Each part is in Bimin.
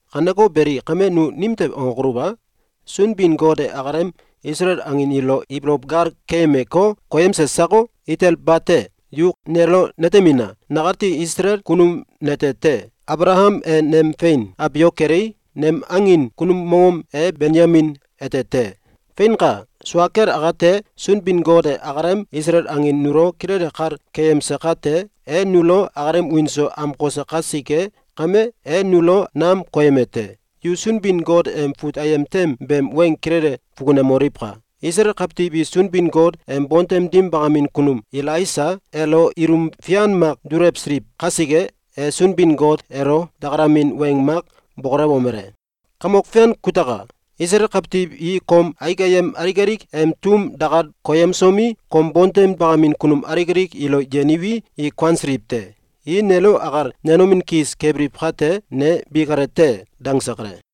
Kaneko beli, kame nu nimtew angokoluw a? Sunbin-Got e akalem Isalael angin ilo ibolow gal keyemeko, koyemse sako? Itel bate! Yu nelo netemina! Nakati Isalael kunum nete te! Abalakam e nem fein abiok kelei, nem angin kunum mongom e Benyamin ete te. Feinka! Sua kel akate, Sunbin-Got e akalem Isalael angin nulo kilele kal keyemse kate, e nulo akalem wiin so amkose kasike kame, e nulo nam koyeme te. Yu Sunbin-Got em fut ayem tem beem weng kilele fukunemoliwka! Isalael kawtiw i Sunbin-Got em bontem dim bakamin kunum Elaisa elo ilum fian mak dulewsiliw kasike, e Sunbin-Got elo dakalamin weng mak bokolewomele: “Kamok Fian kutaka! Isalael kawtiw i kom aik ayem alik alik em tum dakal koyemsomi, kom bontem bakamin kunum alik alik ilo yeniwi, i kuansiliw te. I nelo akal nenomin kis kebiliw kate, ne bi kale te!”, dangse kale.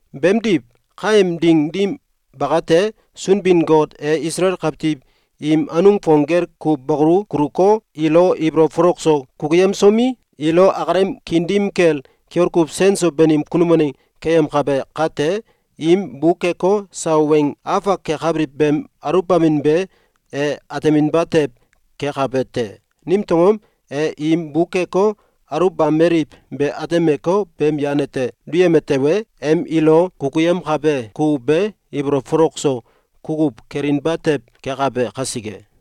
Beemdiw, kaem ding dim bakate, Sunbin-Got e Isalael kawtiw im anung fong gel kuw bakolu kuluko, ilo ibolow folok so kukuyemsomi, ilo akalem kiin dim kel kiol kuw sen so banim kunum waneng keyemkabe kate, im bukeko, sawa weng afak kakabiliw beem aluwbamin be e ateminba tew kekabe te. Nimtew angom? E im bukeko, aluwbameliw be atemeko, beem yan ete duyeme tewe, em ilo kukuyemkabe kukuw be ibolow folok so kukuw kelinba tew kekabe kasike.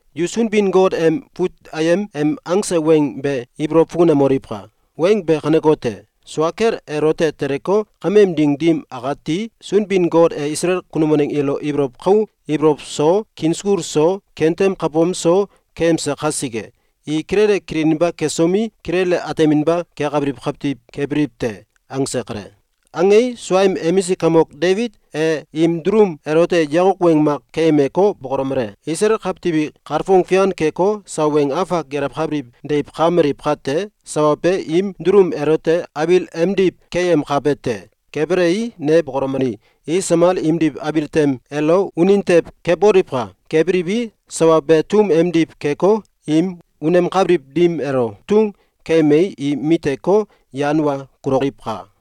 Yu Sunbin-Got em fut ayem em angse weng be ibolow fukunemoliwka! Weng be kanekote: Sua kel elote teleko, kameem ding dim akati, Sunbin-Got e Isalael kunum waneng ilo ibolow kau ibolow so, kiin sukul so, kentem kabom so keyemse kasike, i kilele kililinba kesomi, kilele ateminba kekabiliw kawtiw kebiliw te.”, angse kale. Angei, suaem emisik kamok Debit e im dulum elote yakok weng mak keyemeko, bokolomele: “Isalael kawtiw i kalfong fian keko, sawa weng afak gelewkabiliw deiw kakameliw kate, sawa be im dulum elote abil emdiw keyemkabe te. Kebelei, ne bokolomeli: ‘I samal imdiw abil tem elo unin tew keboliwka! Kebiliwi, sawa be tum emdiw keko, im unemkabiliw dim elo tung keyemei, i miteko, yan wa kuloliwka!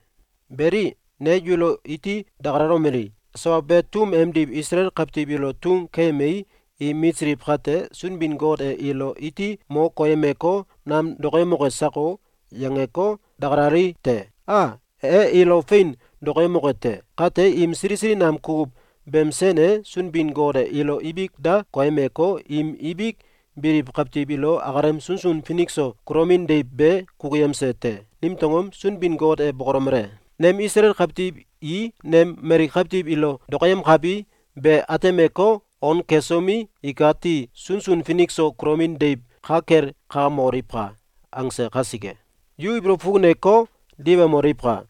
Beli, ne yulo iti dakalomeli: “Sawa be tum emdiw Isalael kawtiw ilo tung keyemei, i mitsiliw kate, Sunbin-Got e ilo iti mo koyemeko, nam dokoyemoke sako?”, yangeko, dakalali te. A, e ilo fein dokoyemoke te! Kate im sili sili nam kukuw beem sen e Sunbin-Got e ilo ibik da koyemeko, im ibik biliw kawtiw ilo akalem sunsun finik so kulomin deiw be kukuyemse te. Nimtew angom? Sunbin-Got e bokolomele: “Nem Isalael kawtiw i nem mali kawtiw ilo dokoyemkabi be atemeko, on kesomi, ikati sunsun finik so kulomin deiw ka kel kakamoliwka!”, angse kasike. Yu ibolow fukuneko, diwemoliwka!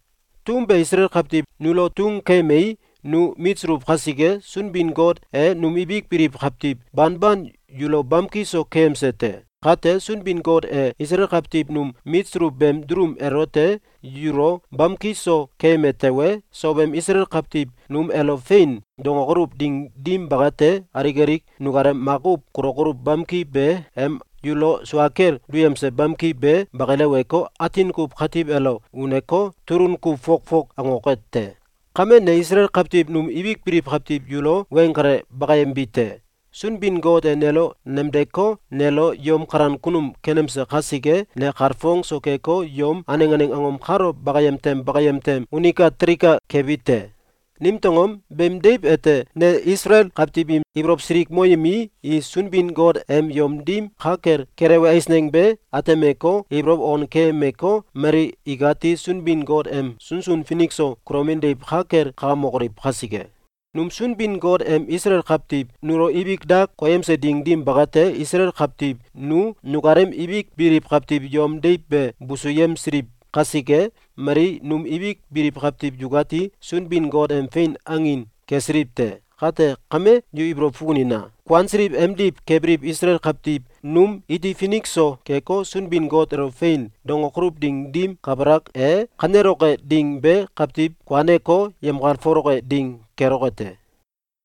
Tum be Isalael kawtiw nulo tung keyemei, nu mitsuluw kasike, Sunbin-Got e num ibik biliw kawtiw banban yulo bamki so keyemse te. Kate, Sunbin-Got e Isalael kawtiw num mitsuluw beem dulum elote yulo bamki so keyeme tewe, sow em Isalael kawtiw num elo “Fein!”, dangokoluw ding dim bakate, alik alik nukalem makuw kulokoluw bamki be em yulo sua kel duyemse bamki be bakileweko, atin kuw katiw elo uneko, tulun kuw fok fok angoke te. Kame, ne Isalael kawtiw num ibik biliw kawtiw yulo weng kale bakayembi te. Sunbin-Got e nelo nemdeko, nelo yom kalan kunum kenemse kasike, ne kalfong so keko, yom aneng aneng angom kalo bakayem tem bakayem tem unika telika kebi te. Nimtew angom? Beem deiw ete ne Isalael kawtiw im ibolow silikmoyemii, i Sunbin-Got em yom dim ka kel kelewe eisneng be atemeko, ibolow on keyemeko, mali ikati Sunbin-Got em sunsun finik so kulomin deiw ka kel kakamokoliw kasike. Num Sunbin-Got em Isalael kawtiw nulo ibik da koyemse ding dim bakate, Isalael kawtiw nu nukalem ibik biliw kawtiw yom deiw be busuyemsiliw kasike, mali num ibik biliw kawtiw yukati Sunbin-Got em fein angin kesiliw te. Kate kame, yu ibolow fukunina! Kuansiliw emdiw kebiliw Isalael kawtiw num iti finik so keko, Sunbin-Got elo “Fein!”, dangokoluw ding dim kabalak e, kaneloke ding be kawtiw kuaneko, yemkalfoloke ding keloke te.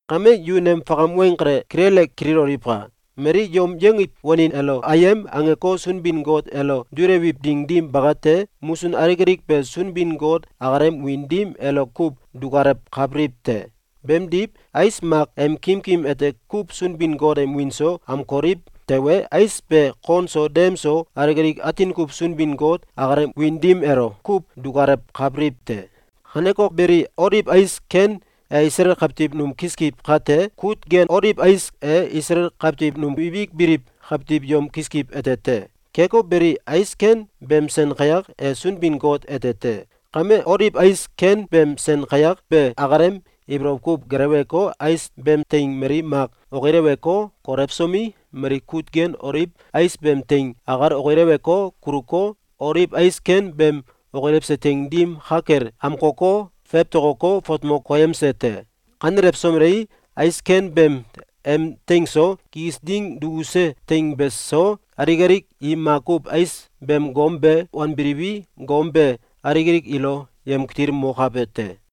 Kame, yu nem fakam weng kale kilele kililoliwka! Mali yom yongiw wanin elo “Ayem!”, angeko, Sunbin-Got elo dulewiw ding dim bakate, musun alik alik be Sunbin-Got akalem wiin dim elo kuw dukalewkabiliw te. Beemdiw, ais mak em kimkim ete kuw Sunbin-Got em wiin so amkoliw tewe, ais be kon so dem so alik alik atin kuw Sunbin-Got akalem wiin dim elo kuw dukalewkabiliw te. Kaneko beli, Oliw ais ken e Isalael kawtiw num kiskiw kate, kut gen oliw ais e Isalael kawtiw num ibik biliw kawtiw yom kiskiw ete te. Keko beli, ais ken beem sen kayak e Sunbin-Got ete te. Kame, Oliw ais ken beem sen kayak be akalem ibolow kuw geleweko, ais beem teing mali mak okileweko, kolewsomi, mali kut gen oliw ais beem teing akal okilewko, kuluko, oliw ais ken beem okilewse teing dim ka kel amkoko, fewtokoko, fatmo koyemse te. Kanelewsomelei, ais ken beem em teing so, kikis ding dukuse teing beso, alik alik i makuw ais beem gom be wanbiliwi, gom be alik alik ilo yemkitilmokabe te.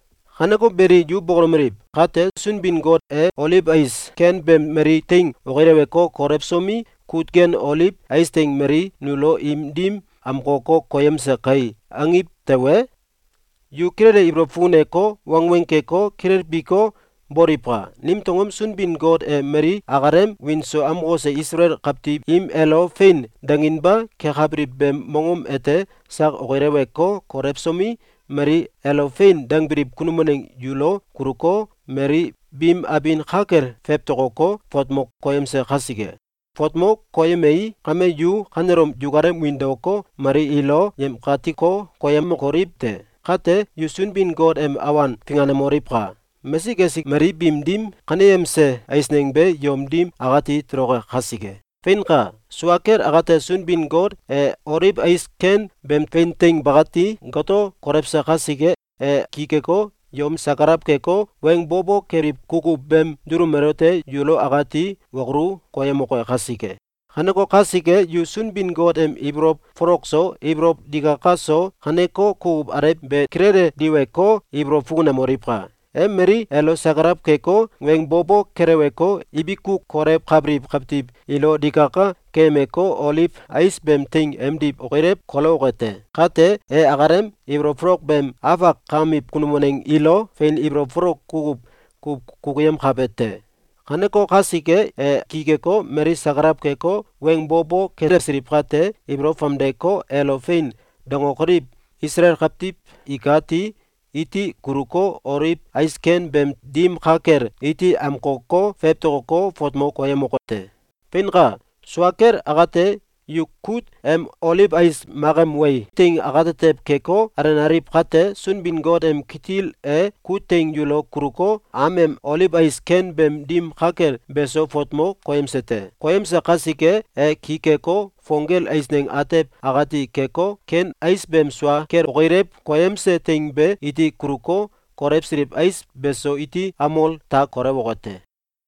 Kaneko beli, yu bokolomeliw: “Kate, Sunbin-Got e oliw ais ken beem mali teing okileweko, kolewsomi, kut gen oliw ais teing mali nulo im dim amkoko, koyemse kai!”, angiw tewe, yu kilele ibolow fukuneko, wangweng keko, kilelbiko, boliwka! Nimtew angom? Sunbin-Got e mali akalem wiin so amkose Isalael kawtiw im elo “Fein!”, danginba kekabiliw beem mongom ete sak okileweko, kolewsomi, mali elo “Fein!”, dangbiliw kunum waneng yulo kuluko, mali biim abin ka kel fewtokoko, fatmo koyemse kasike. Fatmo koyemei, kame yu kanelom yukalem wiin daoko, mali ilo yemkatiko, koyemokoliw te! Kate, yu Sunbin-Got em awan finganemoliwka! Mesik esik mali biim dim kaneyemse eisneng be yom dim akati toloke kasike! Feinka! Sua kel akate, Sunbin-Got e oliw ais ken beem fein teing bakati goto kolewse kasike, e ki keko, yom sakalaw keko, weng bo bo keliw kukuw beem dulum elote yulo akati wokolu koyemoke kasike. Kaneko kasike, yu Sunbin-Got em ibolow folok so, ibolow digaka so, kaneko kukuw alew be kilele diweko, ibolow fukunemoliwka! E mali elo sakalaw keko, weng bo bo keleweko, ibiku kolewkabiliw kawtiw ilo digaka keyemeko, oliw ais beem teing emdiw okilew kolewoke te. Kate, e akalem ibolow folok beem afak kakamiw kunum waneng ilo fein ibolow folok kukuw kuw kukuyemkabe te. Kaneko kasike, e ki keko, mali sakalaw keko, weng bo bo kelewsiliw kate, ibolow famdeko, elo “Fein!”, dangokoliw Isalael kawtiw ikati iti kuluko, oliw ais ken beem dim ka kel iti amkoko, fewtokoko, fatmo koyemoke te. Feinka! Sua kel akate, yu kut em oliw ais mak em wei teing akatetew keko, alenaliw kate, Sunbin-Got em kitil e kut teing yulo kuluko, am em oliw ais ken beem dim ka kel beso fatmo koyemse te. Koyemse kasike, e ki keko, fong gel eisneng atew akati keko, ken ais beem sua kel okilew koyemse teing be iti kuluko, kolewsiliw ais beso iti amol ta kolewoke te.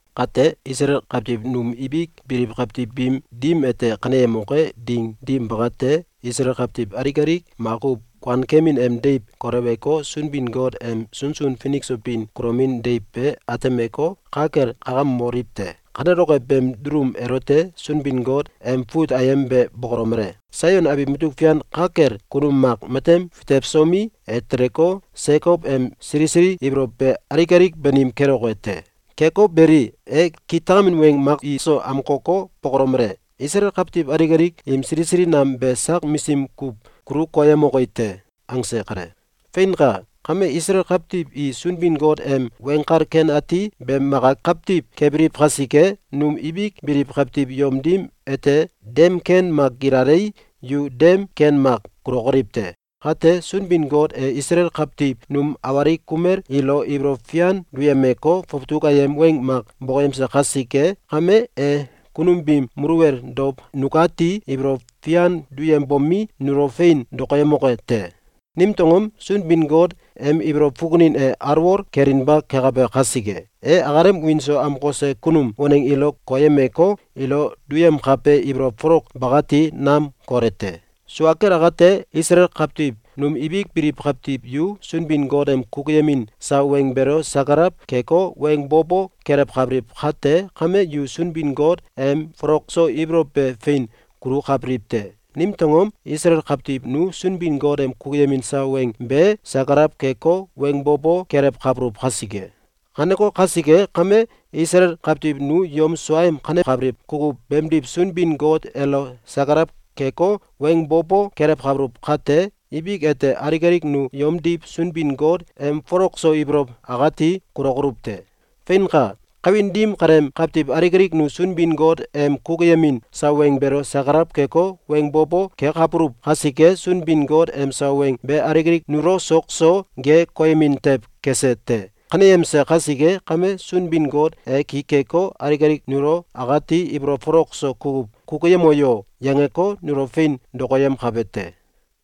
Kate, Isalael kawtiw num ibik biliw kawtiw biim dim ete kaneyemoke ding dim bakate, Isalael kawtiw alik alik makuw kuankemin em deiw koleweko, Sunbin-Got em sunsun finik so bin kulomin deiw be atemeko, ka kel kakamoliw te. Kaneloke beem dulum elote Sunbin-Got em fut ayem be bokolomele: “Saion abiw mutuk fian ka kel kunum mak matem fitewsomi, e teleko, Sekow em sili sili ibolow be alik alik banim keloke te. Keko beli, e kitakamin weng mak iso amkoko, bokolomele: Isalael kawtiw alik alik im sili sili nam be sak misim kuw kulu koyemoki te.”, angse kale. Feinka! Kame Isalael kawtiw i Sunbin-Got em Weng Kal Ken Ati beem maka kawtiw kebiliw kasike, num ibik biliw kawtiw yom dim ete dem ken mak gilalei, yu dem ken mak kulokoliw te. Kate, Sunbin-Got e Isalael kawtiw num awalik kumel ilo ibolow fian duyemeko, fawtuk ayem weng mak bokoyemse kasike kame, e kunum biim muluwel dow nukati ibolow fian duyembomi, nulo fein dokoyemoke te. Nimtew angom? Sunbin-Got em ibolow fukunin e alwol kelinba kekabe kasike. E akalem wiin so amkose kunum waneng ilo koyemeko, ilo duyemkabe ibolow folok bakati nam kole te. Sua kel akate, Isalael kawtiw num ibik biliw kawtiw yu Sunbin-Got em kukuyemin sawa weng beelo sakalaw keko, weng bo bo kelewkabiliw kate kame, yu Sunbin-Got em folok so ibolow be fein kulukabiliw te. Nimtew angom? Isalael kawtiw nu Sunbin-Got em kukuyemin sawa weng be sakalaw keko, weng bo bo kelewkabuluw kasike. Kaneko kasike kame, Isalael kawtiw nu yom suaem kanekabiliw kukuw beemdiw Sunbin-Got elo sakalaw keko, weng bo bo kelewkabuluw kate, ibik ete alik alik nu yomdiw Sunbin-Got em folok so ibolow akati kulokoluw te. Feinka! Kawin dim kaleem kawtiw alik alik nu Sunbin-Got em kukuyemin sawa weng beelo sakalaw keko, weng bo bo kekabuluw kasike, Sunbin-Got em sawa weng be alik alik nulo sok so ge koyemin tew kese te. Kaneyemse kasike kame, Sunbin-Got e ki keko, alik alik nulo akati “Ibolow folok so kukuw kukuyemo yo!”, yangeko, nulo fein dokoyemkabe te.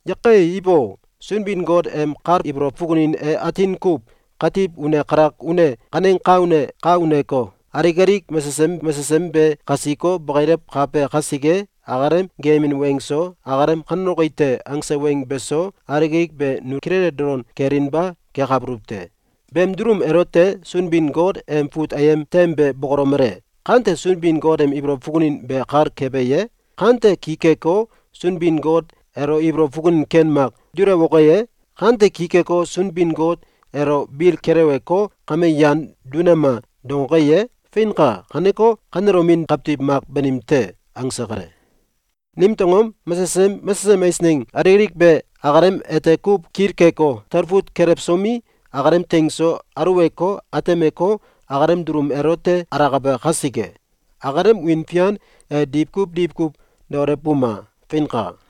Yake! Ibo! Sunbin-Got em kal ibolow fukunin e atin kuw katiw une kalak une kaneng ka une ka uneko, alik alik mesesem mesesem be kasiko, bakilewkabe kasike, akalem geeyemin weng so, akalem “Kaneloki te”, angse weng beso, alik alik be nu kilele dolon kelinba kekabuluw te. Beem dulum elote Sunbin-Got em fut ayem tem be bokolomele: “Kante Sunbin-Got em ibolow fukunin be kal kebe ye? Kante ki keko, Sunbin-Got elo ibolow fukunin ken mak dulewoke ye? Kante ki keko, Sunbin-Got elo bil keleweko, ‘Kame, yan dunema!’, dangoke ye? Feinka! Kaneko, kanelomin kawtiw mak banim te.”, angse kale. Nimtew angom? Mesesem mesesem angom alik alik be akalem ete kuw kilkeko, talfut kelewsomi, akalem teing so aluweko, atemeko, akalem dulum elote alakabe kasike. Akalem wiin fian e diwkuw diwkuw daolewbuma! Feinka.